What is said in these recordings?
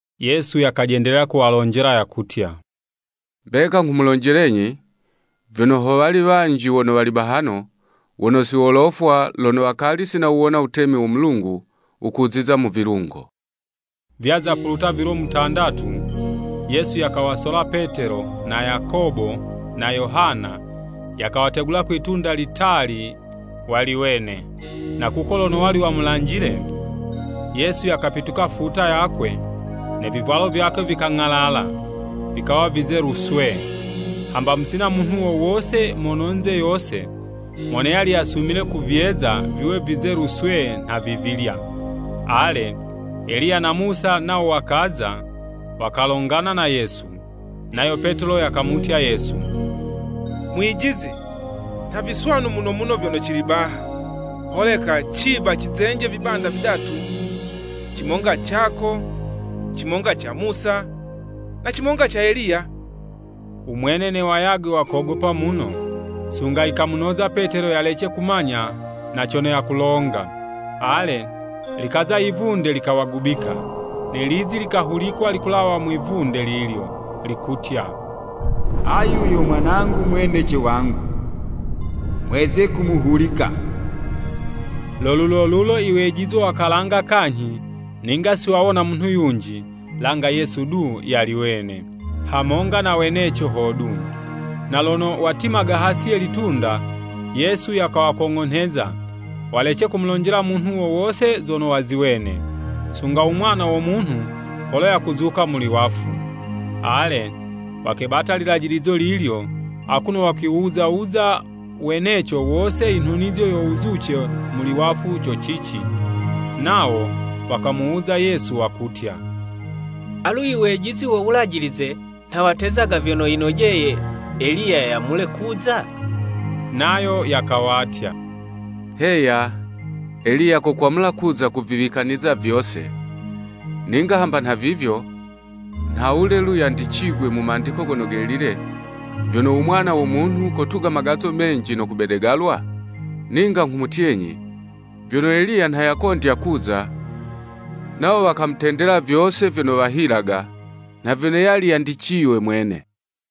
Yesu yakajendelela kuwalonjela yakutya, “Mbeka nghumulonjelenyi, vyono, ho wali wanji wono wali bahano, wono si wolofwa, lono wakali si nawuwona wutemi wo Mulungu wukuziza mu vilungo.” Vyaza puluta vilo mutandatu, Yesu yakawasola Petelo, na Yakobo na Yohana, yakawategula kwi'tunda litali wali wene. Na kuko lono wali wamulanjile, Yesu yakapituka futa yakwe, ne vivwalo vyakwe vikang'alala, vikawa vizelu swee, hamba musina munhu wo wose mononze yose, mono yali yasumile kuvyeza viwe vizelu swee nha vivilya. Ale, Eliya na Musa nawo wakaza wakalongana na Yesu. Nayo Petelo yakamutya Yesu, “Mwijizi, nha viswanu muno muno vyono cili baha. Holeka ciba cizenje vibanda vidatu, cimonga cako, cimonga ca Musa na cimonga ca Eliya.” Umwene ne wayagwe wakogopa muno, sunga yikamunoza Petelo yalece kumanya na cono yakulonga. Ale, likaza yivunde likawagubika, ne lizi likahulikwa likulawa mwi'vunde lilyo, likutya, “Ayu yo Mwanangu mwendece wangu, mweze kumuhulika.” Lo lulolulo iwejizwa wakalanga kanyhi, ninga siwawona munhu yunji, langa Yesu du yali wene, hamonga na weneco hodu. Na lono watimaga hasi ye litunda, Yesu yakawakong'onheza, walece kumulonjela munhu wo wose zono waziwene, sunga u Mwana wo Munhu kolo yakuzuka muli wafu. Ale, wakebata lilajilizo lilyo, akuno wakwiwuza wuza weneco wose i nhunizo yo wuzuce muli wafu co cici. Nawo wakamuwuza Yesu, wakutya, “Alu iwejizi wo Wulajilize nha watezaga vyono yinojeye Eliya yamule kuza?” Nayo yakawatya, “Heya, Eliya kokwamula kuza kuviwikaniza vyose. Ninga hamba nhavivyo, nhawule, lu, yandicigwe mu Mandiko Gono Gelile, vyono, u Mwana wo Munhu kotuga magazo menji no kobedegalwa? Ninga nghumutyenyi, vyono Eliya nha yakondya kuza, nawo wakamutendela vyose vyono wahilaga, nha vyono yali yandiciywe mwene.”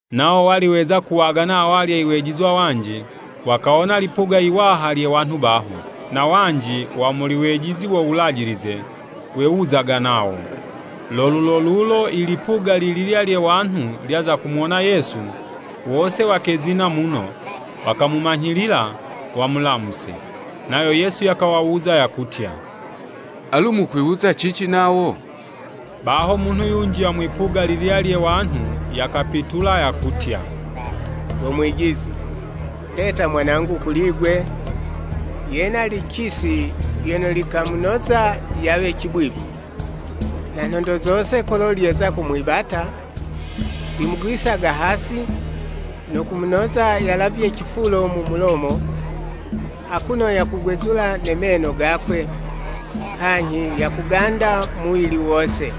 Nawo wali weza kuwagana awalya iwejizwa wanji, wakawona lipuga yiwaha lye wanhu baho. Na wanji wa mu wejizi wo Wulajilize, wewuzaga nawo. Lo lulolulo ilipuga lililya lye wanhu lyaza kumuwona Yesu, wose wakezina muno, wakamumanyhilila wamulamuse. Nayo Yesu yakawawuza yakutya, “Alu mukwiwuza cici nawo?” Baho munhu yunji wa mwipuga lililya lye wanhu yakapitula, yakutya, “Go Mwijizi, ndeta mwanangu kuli 'gwe, yena licisi lyono likamunoza yawe cibwibwi. Na nhondo zose kolo lyeza kumwibata, limugwisaga hasi, no kumunoza yalavye cifulo mu mulomo, akuno yakugwezula ne meno gakwe, kanyhi yakuganda muwili wose.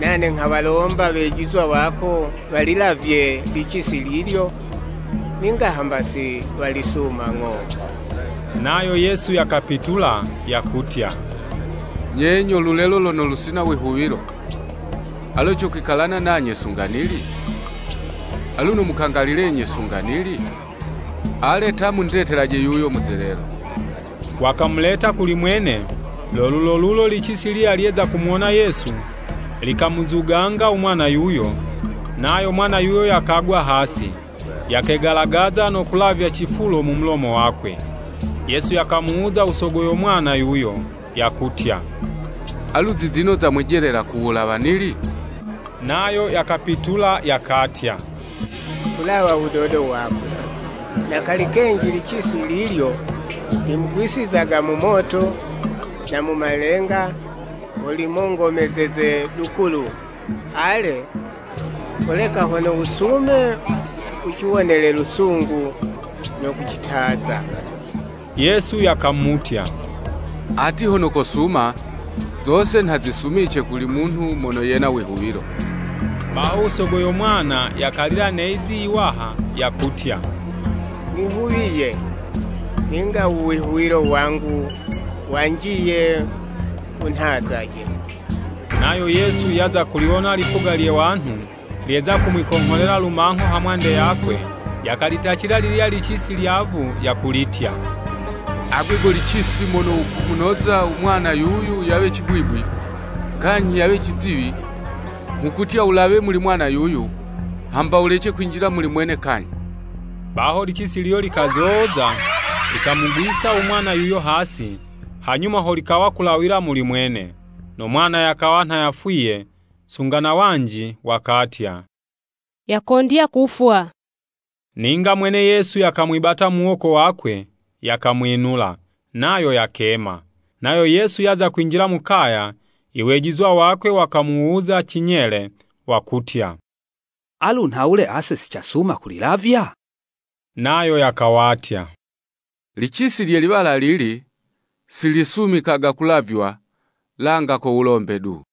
Nane nghawalomba iwejizwa wako walilavye licisi lilyo, ninga hamba siwalisuma ng'o.” Nayo Yesu yakapitula, yakutya, “Nye nyo lulelo lono lusina wihuwilo! Alu cokwikalana nanye sunga nili? Alu nomukangalilenyi sunga nili? Ale ta, mundetelaje yuyo muzelelo.” Wakamuleta kuli mwene. Lo lulolulo licisi lilyo lyeza kumuwona Yesu, likamuzuganga umwana yuyo, nayo mwana yuyo yakagwa hasi, yakegalagaza no kulavya cifulo mu mulomo wakwe. Yesu yakamuwuza u sogwe yo mwana yuyo, yakutya. “Alu zizino zamwijelela ku wulawa nili?” Nayo yakapitula, yakatya, “Kulawa wudodo wakwe. Na kali kenji licisi lilyo, limugwisizaga mu moto na mu malenga, ho limongomezeze lukulu. Ale, holeka hono wusume, wuciwonele lusungu no kucitaza.” Yesu yakamutya, “Ati hono kosuma! Zose nha zisumice kuli munhu mono yena wihuwilo.” Baho, u sogo yo mwana yakalila ne'zi iwaha, yakutya, “Nihuwiye! Ninga uwihuwilo wangu wanjiye, wunhazaje.” Nayo Yesu yaza kuliwona lipuga lye wanhu lyeza kumwikongholela lumangho hamwande yakwe, yakalitacila lililya licisi lyavu yakulitya, “Agwe go licisi mono wukumunoza u mwana yuyu yawe cibwibwi kanyhi yawe ciziwi, nghukutya, wulawe muli mwana yuyu, hamba wulece kwinjila muli mwene kanyhi!” Baho licisi lilyo likazoza, likamugwisa u mwana yuyo hasi, hanyuma ho likawa kulawila muli mwene. No mwana yakawa nha yafwiye, sunga na wanji wakatya, “Yakondya kufwa!” Ninga mwene Yesu yakamwibata muwoko wakwe, yakamwinula, nayo yakema. Nayo Yesu yaza kwinjila mu kaya, iwejizwa wakwe wakamuwuza cinyele wakutya, “Alu nhawule ase sicasuma kulilavya?” Nayo yakawatya, “Licisi lye liwala lili, silisumikaga kulavywa, langa ko wulombe du.”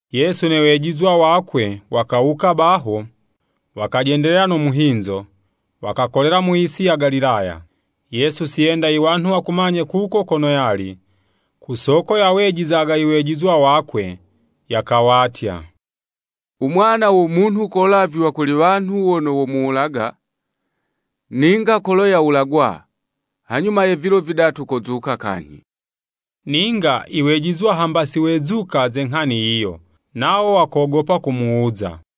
Yesu ne wejizwa wakwe wakawuka baho, wakajendelela no muhinzo, wakakolela mu yisi ya Galilaya. Yesu siyenda iwanhu wakumanye kuko kono yali, kusoko yawejizaga iwejizwa wakwe. Yakawatya, “Umwana wo Munhu kolavywa kuli wanhu wono womuwulaga, ninga kolo yawulagwa, hanyuma ye vilo vidatu kozuka kanyhi.” Ninga i wejizwa hamba si wezuka ze nghani yiyo. Nawo wakogopa kumuwuza.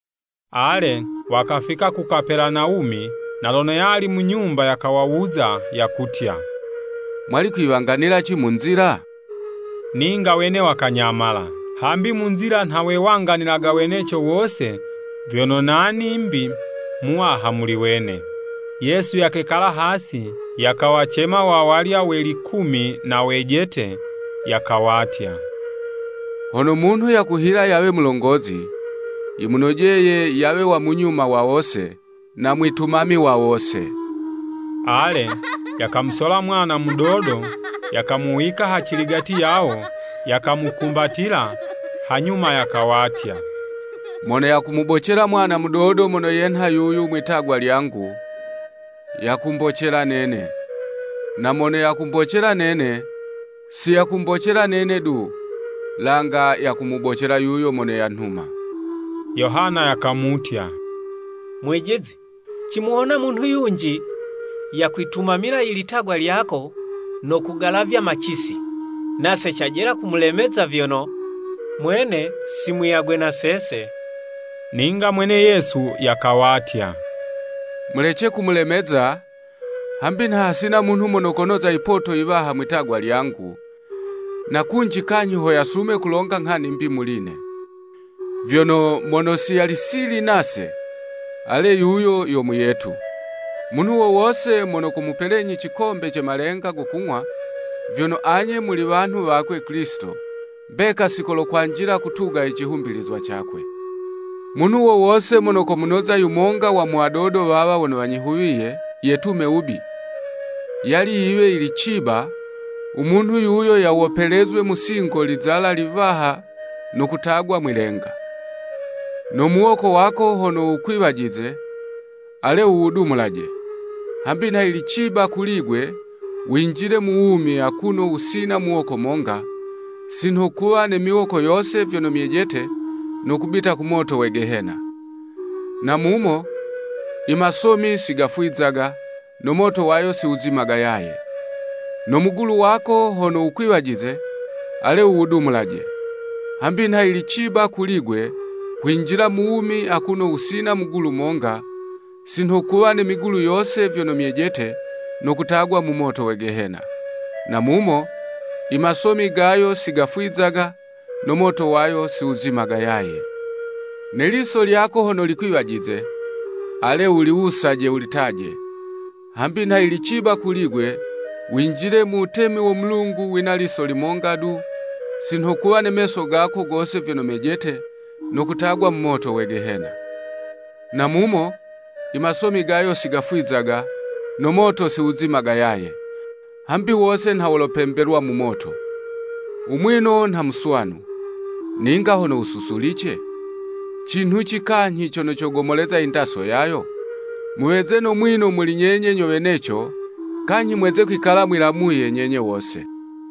Ale, wakafika ku Kapelanawumi. Na lono yali mu nyumba yakawawuza, yakutya, “Mwali kwiwanganilaci mu nzila?” Ninga wene wakanyamala, hambi mu nzila nha wewanganilaga weneco wose vyono nani 'mbi muwaha muli wene. Yesu yakekala hasi, yakawacema wawalya we likumi na wejete, yakawatya, “Hono munhu yakuhila yawe mulongozi, yimunojeye yawe wa munyuma wa wose, na mwitumami wa wose.” Ale, yakamusola mwana mudodo, yakamuwika haciligati yawo, yakamukumbatila, hanyuma yakawatya, “Mono yakumubocela mwana mudodo mono yenha yuyu mwi'tagwa lyangu, yakumbocela nene, na mono yakumbocela nene, siyakumbocela nene du, langa yakumubocela yuyo mono yanhuma.” Yohana yakamutya, “Mwijizi, cimuwona munhu yunji yakwitumamila i litagwa lyako no kugalavya macisi, nase cajela kumulemeza vyono mwene si muyagwe na sese.” Ninga mwene Yesu yakawatya, “Mulece kumulemeza, hambi nha hasina munhu mono konoza yipoto yiwaha mwi'tagwa lyangu, na kunji kanyhi ho yasume kulonga nghani 'mbi muli'ne. Vyono, mono si yali sili nase, ale yuyo yo muyetu. Munhu wo wose mono komupelenyi cikombe ce malenga go kung'wa, vyono anye muli wanhu wakwe Kilisito, mbeka sikolokwanjila kutuga i cihumbilizwa cakwe. “Munhu wo wose mono komunoza yumonga wa mu wadodo wawa wono wanyihuwiye yetume wubi, yali yiwe yili ciba, u munhu yuyo yawopelezwe mu singo lizala liwaha no kutagwa mwi'lenga. No muwoko wako hono wukwiwajize, ale wuwudumulaje! Hambi nha yili ciba kuli'gwe winjile mu wumi, akuno wusina muwoko monga, si nho kuwa ne miwoko yose vyono myejete no kubita ku moto we Gehena. [ Na mumo, i masomi sigafwizaga, no moto wayo siwuzimaga yaye.] No mugulu wako hono wukwiwajize, ale wuwudumulaje! Hambi nha yili ciba kuli'gwe kwinjila mu wumi akuno wusina mugulu monga, si nho kuwa ne migulu yose vyono myejete no kutagwa mu moto we Gehena. [ Na mumo, i masomi gayo sigafwizaga, no moto wayo siwuzimaga yaye.] Ne liso lyako hono likwiwajize, ale wuliwusaje wulitaje, hambi nha yili ciba kuli'gwe winjile mu wutemi wo Mulungu wina liso limonga du, si nho kuwa ne meso gako gose vyono mejete, no kutagwa mu moto we Gehena. Na mumo i masomi gayo sigafwizaga, no moto siwuzimaga yaye. Hambi wose nha wolopembelwa mu moto. Umwino nha muswanu, ninga hono wususulice, cinhuci kanyhi cono cogomoleza indaso yayo? Muweze no mwino muli nyenye nyo weneco, kanyhi mweze kwikala mwilamuye nyenye wose.”